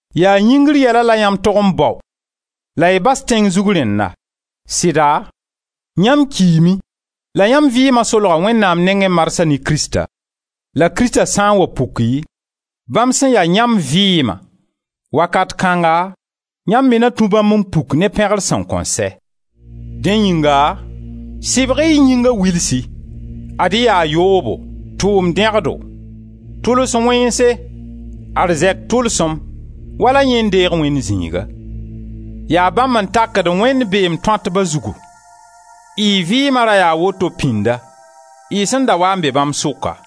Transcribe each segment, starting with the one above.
Yaa yĩngr yɛla la yãmb tog n bao la y bas tẽng zug rẽnna. Sɩda, yãmb kiime la yãmb vɩɩma solga Wẽnnaam nengẽ marsã ne Krista. La Krista sã n wa puki, bãmb sẽn ya yãmb vɩɩma, wakat kãnga yãmb me na tũ bãmb n puk ne pẽgr sẽn kõn sɛ. Dẽ yĩnga sɩbg-y y yĩnga wilsi. Ad-y yaa yoobo, tʋʋm dẽgdo, tʋls wẽnse, arzɛk tʋlsem, wala yẽ n deeg wẽnd zĩiga: yaa bãmb n takd Wẽnd beem tõatba zugu. Y vɩɩma ra yaa woto pĩnda, y sẽn da waa n be bãmb sʋka.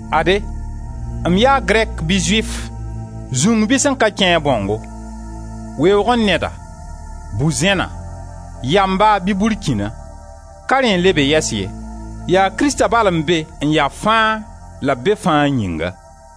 Ade, m yaa Grɛk, bɩ Zʋɩf, zũng bɩ sẽn ka kẽ-a bãongo, weoogẽ neda, bu-zẽna, yamba bɩ burkĩna, ka rẽ n le be yɛs ye. Yaa Krista bal n be n ya fãa la b be fãa yĩnga.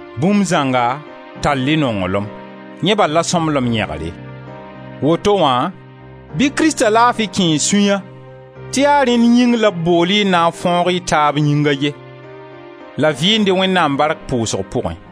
Bũmb zãnga tall-y nonglem: yẽ bal la sõmblem yẽgre. Woto wã bɩ Krista laafi kẽe y sũya tɩ yaa rẽnd yĩng la b bool-y n na fãoog-y taab Yĩng a ye. La vɩɩnd-y Wẽnnaam bark pʋʋsg pʋgẽ.